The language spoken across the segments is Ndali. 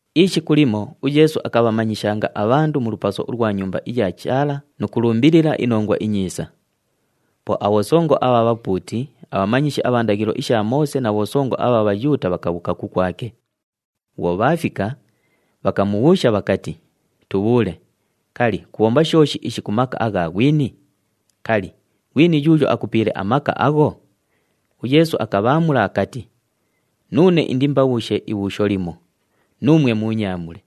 Ishiku limo uYeesu akabhamanyishanga abhandu mu lupaso ulwa Nyumba iya Chaala nu kulumbilila iNongwa iNyiisa. Po abhosongo abha bhapuuti, abhamanyishi abha ndaghilo isha Moose na bhosongo abha Bhayuuta bhakabhuuka kukwake. Bhwo bhaafika, bhakamubhuusha bhakati, “Tubhuule, kali, kubhomba shooshi ishi ku maka agha ghwini? Kali, ghwini yuuyo akupiile amaka agho?” UYeesu akabhaamula akati, “Nuune indiimbabhuushe ibhuusho limo, nuumwe muunyaamule.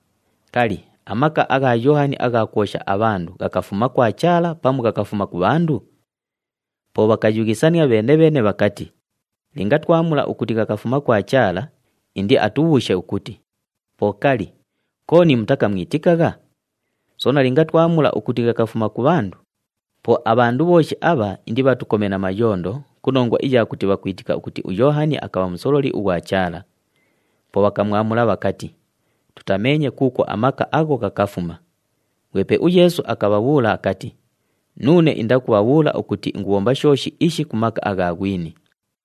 Kali, amaka agha Yoohani agha kwosha abhandu, ghakafuma kwa Chaala pamu ghakafuma ku bhandu?” Po bhakayughisania bheene-bheene bhakati, “Linga twamwamula ukuti ghakafuma kwa Chaala, indiatubhuushe ukuti, ‘Po kali, kooni mutakamwitikagha?’ Soona linga twamwamula ukuti ghakafuma ku bhandu, po abhandu bhooshi abha indibhatukome na mayondo ku nongwa iya kuti bhakwitika ukuti uYoohani akabha musololi ughwa Chaala.” Po bhakamwamula bhakati, “Tutameenye kuukwo amaka agho ghakafuma.” Ghwepe uYeesu akabhabhuula akati, “Nuune indakubhabhuula ukuti ingubhomba shooshi ishi ku maka agha ghwini.”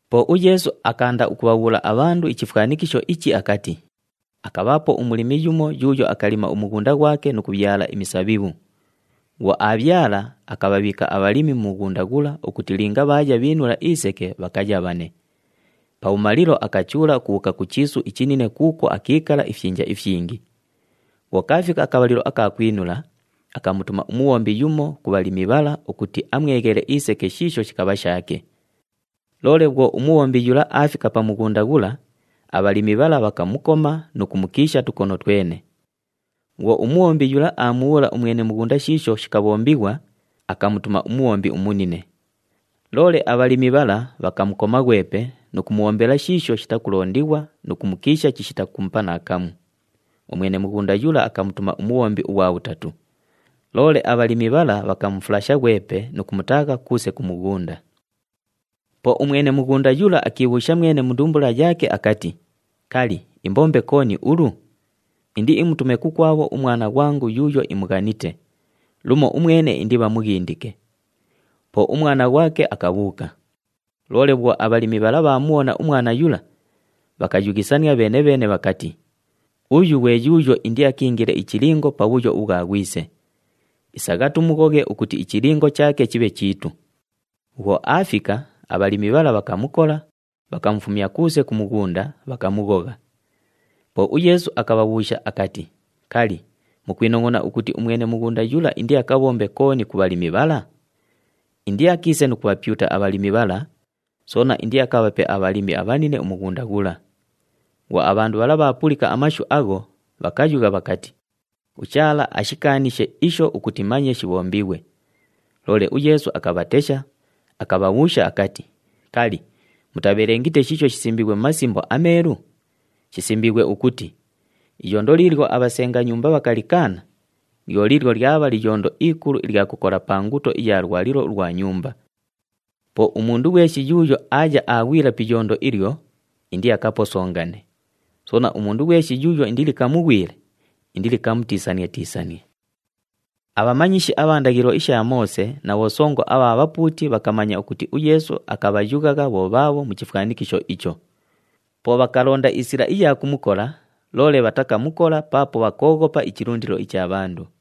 Po uYeesu akaanda ukubhabhuula abhandu ichifwanikisho ichi akati, “Akabhaapo umulimi yumo yuuyo akalima umughunda ghwake nu kubhyala imisabhibhu. Bhwo aabhyala, akabhabhiika abhalimi mu mughunda ghula ukuti linga bhaaya bhiinula iseke bhakayabhane. Pabhumalilo, akachuula ukubhuuka ku chiisu ichinine kuukwo akiikala ifyinja ifyingi. Bhwo kaafika akabhalilo aka kwinula, akamutuma umubhombi yumo ku bhalimi bhala ukuti amweghele iseke shiisho shikabha shaake. Loole bhwo umubhombi yula aafika pa mughunda ghula, abhalimi bhala bhakamukoma nu kumukiisha tukono twene. Bhwo umubhombi yula aamubhuula umwene mughunda shiisho shikabhombighwa, akamutuma umubhombi umunine. Loole abhalimi bhala bhakamukoma ghwepe nu kumubhombela shiisho shitakulondighwa nu kumukiisha chishita kumupa naakamu. Umwene mughunda yula akamutuma umubhombi ughwa bhutatu. Loole abhalimi bhala bhakamufulasha ghwepe nu kumutaagha kuuse ku mughunda. “Po umwene mughunda yula akiibhuusha mwene mu ndumbula yaake akati, ‘Kali, imbombe kooni ulu? Indiimutume kukwabho umwana ghwangu yuuyo imughanite! Lumo umwene indibhamughindike.’ Po umwana ghwake akabhuuka. Loole bhwo abhalimi bhala bhaamubhona umwana yula, bhakayughisania bheene-bheene bhakati, ‘Uyu ghwe yuuyo indiakiingile ichilingo pa bhuyo ubhwa ghwise. Isagha tumughoghe ukuti ichilingo chaake chibhe chiitu.’ Bhwo aafika, abhalimi bhala bhakamukola, bhakamufumya kuuse ku mughunda, bhakamughogha.” Po uYeesu akabhabhuusha akati, “Kali, mukwinongʼona ukuti umwene mughunda yula indiakabhombe kooni ku bhalimi bhala? Indiakiise nu kubhapyuta abhalimi bhala, soona indiakabhape abhalimi abhanine umughunda ghula!” Bhwo abhandu bhala bhaapulika amashu agho, bhakayugha bhakati, “UChaala ashikaanishe isho ukuti manye shibhombighwe.” Loole uYeesu akabhatesha, akabhabhuusha akati, “Kali, mutabhelengite shiisho shisimbiighwe mu Masimbo aMeelu? Shisimbiighwe ukuti, ‘Iyondo liilyo abhasenga nyumba bhakalikaana, lyo liilyo lyabha liyondo ikulu ilya kukola pa nguto iya lwalilo ulwa nyumba.’ “Po umundu ghweshi yuuyo aaya aaghwila pi iyondo ilyo, indiakaposongane. Soona, umundu ghweshi yuuyo indilikamughwile, indilikamutiisanie-tiisanie.” Abhamanyishi abha ndaghilo isha Moose na bhosongo abha bhapuuti bhakamanya ukuti uYeesu akabhayughagha bho bhaabho mu chifwanikisho icho. Po bhakalonda isila iya kumukola, loole bhatakamukola paapo bhakooghopa ichilundilo icha bhandu.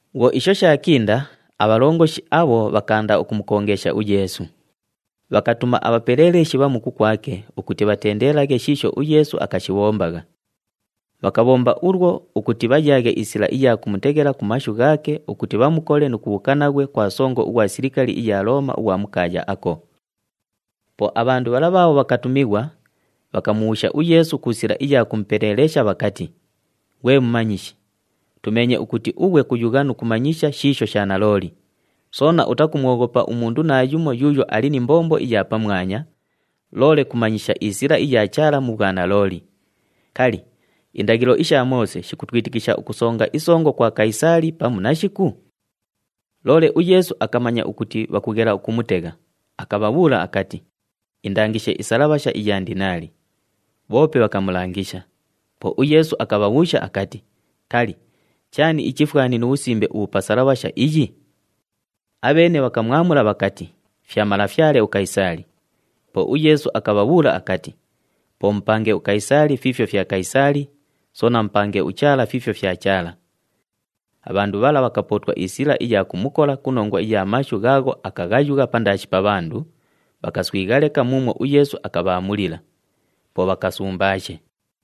Bhwo isho shaakinda, abhalongoshi abho bhakaanda ukumukongeesha uYeesu. Bhakabhatuma abhapeleeleshi bhamu kukwake ukuti bhatendelaghe shiisho uYeesu akashibhombagha. Bhakabhomba ulwo ukuti bhayaaghe isila iya kumuteghela ku mashu ghaake ukuti bhamukole nu kubhuuka naghwe kwa songo ughwa silikali iya Looma ughwa mu kaaya ako. Po abhandu bhala bhaabho bhakatumighwa, bhakamubhuusha uYeesu ku sila iya kumupeleelesha bhakati, “Ghwe Mumanyishi, tumeenye ukuti ughwe kuyugha nu kumanyisha shiisho sha nalooli, soona utakumwoghopa umundu naayumo yuuyo ali ni mbombo iya pamwanya, loole kumanyisha isila iya Chaala mu bhwanalooli. Kali, indaghilo isha Moose shikutwitikisha ukusonga isongo kwa Kayisaali pamu nashiku?” Loole uYeesu akamanya ukuti bhakughela ukumutegha, akabhabhuula akati, “Indangishe isalabhasha iya ndinaali.” Bhoope bhakamulangisha. Po uYeesu akabhabhuusha akati, “Kali, chaani ichifwani nu bhusimbe ubhu bhuli pa salabhasha iyi?” Abheene bhakamwamula bhakati, “Fya malafyale uKayisaali.” Po uYeesu akabhabhuula akati, “Po mupange uKayisaali fiifyo fya Kayisaali, soona mupange uChaala fiifyo fya Chaala.” Abhandu bhala bhakapootwa isila iya kumukola ku nongwa iya mashu ghaagho akaghayugha pandaashi pa bhandu, bhakaswigha leka muumwo uYeesu akabhaamulila. Po bhakasumbaashe.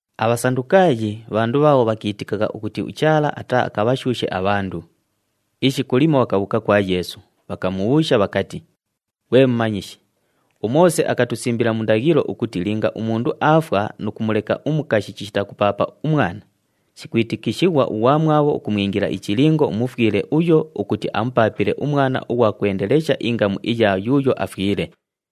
ABhasandukaayi bhandu bhaabho bhakiitikagha ukuti uChaala ataaakabhashuushe abhandu. Ishiku limo bhakabhuuka kwa Yeesu, bhakamubhuusha bhakati, “Ghwe Mumanyishi, uMoose akatusimbila mu ndaghilo ukuti linga umundu aafwa nu kumuleka umukashi chishita kupaapa umwana, shikwitikishighwa ughwamwabho ukumwingila ichilingo umufwile uyo ukuti amupaapile umwana ughwa kwendelesha ingamu iya yuuyo afwile.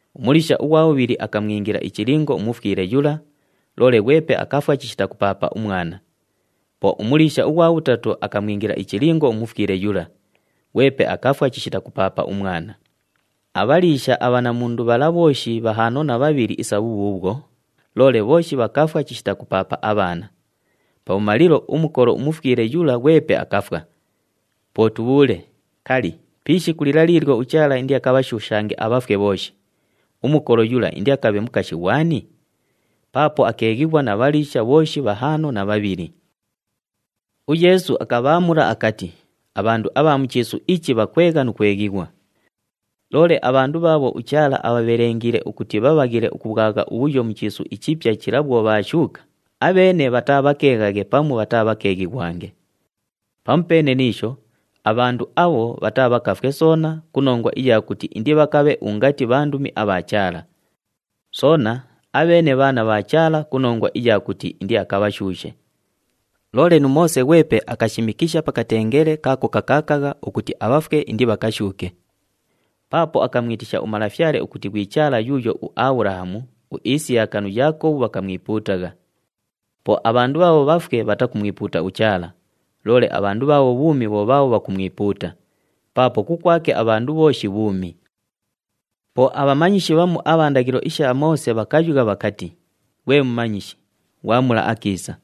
Umuliisha ughwa bhubhili [akamwingila ichilingo umufwile yula, loole ghwepe akafwa chishita kupaapa umwana], po umuliisha ughwa bhutatu akamwingila ichilingo umufwile yula, ghwepe akafwa chishita kupaapa umwana. Abhaliisha abhanamundu bhala bhooshi bhahaano na bhabhili isa bhubhuubhwo, loole bhooshi bhakafwa chishita kupaapa abhaana. Pabhumalilo, umukolo umufwile yula ghwepe akafwa. Po tubhuule, kali, pi ishiku lila liilyo uChaala indiakabhashuushange abhafwe bhooshi, umukolo yula indiakabhe mukashi ghwani? Paapo akeeghighwa na bhaliisha bhooshi bhahaano na bhabhili!” UYeesu akabhaamula akati, “Abhandu abha mu chiisu ichi bhakwegha nu kweghighwa. Loole abhandu bhaabho uChaala abhabhelengiile ukuti bhabhaghile ukubhwagha ubhuyo mu chiisu ichipya chila bhwo bhaashuuka, abheene bhataabhakeeghaghe pamu bhataabhakeeghighwange. Pamupeene ni isho, abhandu abho bhataabhakafwe soona ku nongwa iya kuti indibhakabhe ungati bhandumi abha Chaala. Soona, abheene bhaana bha Chaala ku nongwa iya kuti indiakabhashuushe. Loole nu Moose ghwepe akashimikisha pa katengele kaako kakaakagha, ukuti abhafwe indibhakashuuke. Paapo akamwitisha uMalafyale ukuti ghwi ‘Chaala yuuyo uAbhulahamu, uIsiyaka nu Yaakobhu bhakamwipuutagha.’ Po abhandu bhaabho bhafwe bhatakumwipuuta uChaala, loole abhandu bhaabho bhuumi bho bhaabho bhakumwipuuta, paapo kukwake abhandu bhooshi bhuumi.” Po abhamanyishi bhamu abha ndaghilo isha Moose bhakayugha bhakati, “Ghwe Mumanyishi, ghwamula akiisa!”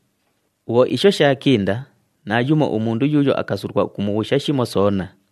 Bhwo isho shaakinda, naayumo umundu yuuyo akasulwa ukumubhuusha shimo soona.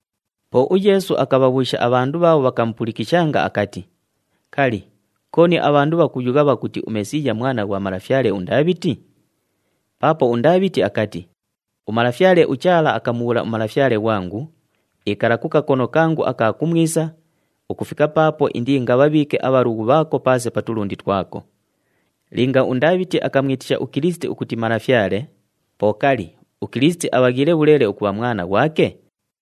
Po uYeesu akabhabhuusha abhandu bhaabho bhakamupulikishanga akati, “Kali, kooni abhandu bhakuyugha bhakuti uMesiiya Mwana ghwa malafyale uNdaabhiti? Paapo uNdaabhiti akati, ‘UMalafyale uChaala akamubhuula uMalafyale ghwangu, “Ikala ku kakono kangu aka kumwisa, ukufika paapo indiingabhabhiike abhalughu bhaako paase pa tulundi twako.” ’ “Linga uNdaabhiti akamwitisha uKilisiti ukuti Malafyale, po kali, uKilisiti abhaghiile bhuleele ukubha mwana ghwake?”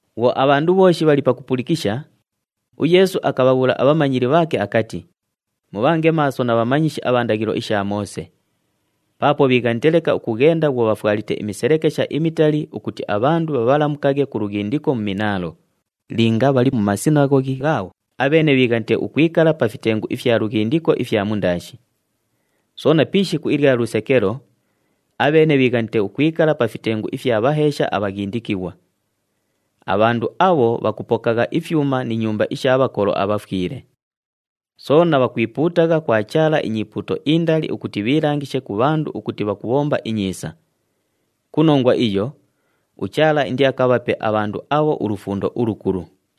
Bhwo abhandu bhooshi bhali pakupulikisha, uYeesu akabhabhuula abhamanyili bhaake akati, “Mubhange maaso na bhamanyishi abha ndaghilo isha Moose! Paapo bhiighanite leka ukughenda bhwo bhafwalite imiselekesha imitali ukuti abhandu bhabhalamukaghe ku lughindiko mu minaalo. Linga bhali mu masinaghoghi ghaabho, abheene bhiighanite ukwikala pa fitengu ifya lughindiko ifya mundaashi. Soona pi ishiku ilya lusekelo, abheene bhiighanite ukwikala pa fitengu ifya bhaheesha abhaghindikighwa. Abhandu abho bhakupokagha ifyuma ni nyumba isha bhakolo abhafwile! Soona bhakwipuutagha kwa Chaala inyipuuto indali ukuti bhiilangishe ku bhandu ukuti bhakubhomba inyiisa. Ku nongwa iyo, uChaala indiakabhape abhandu abho ulufundo ulukulu.”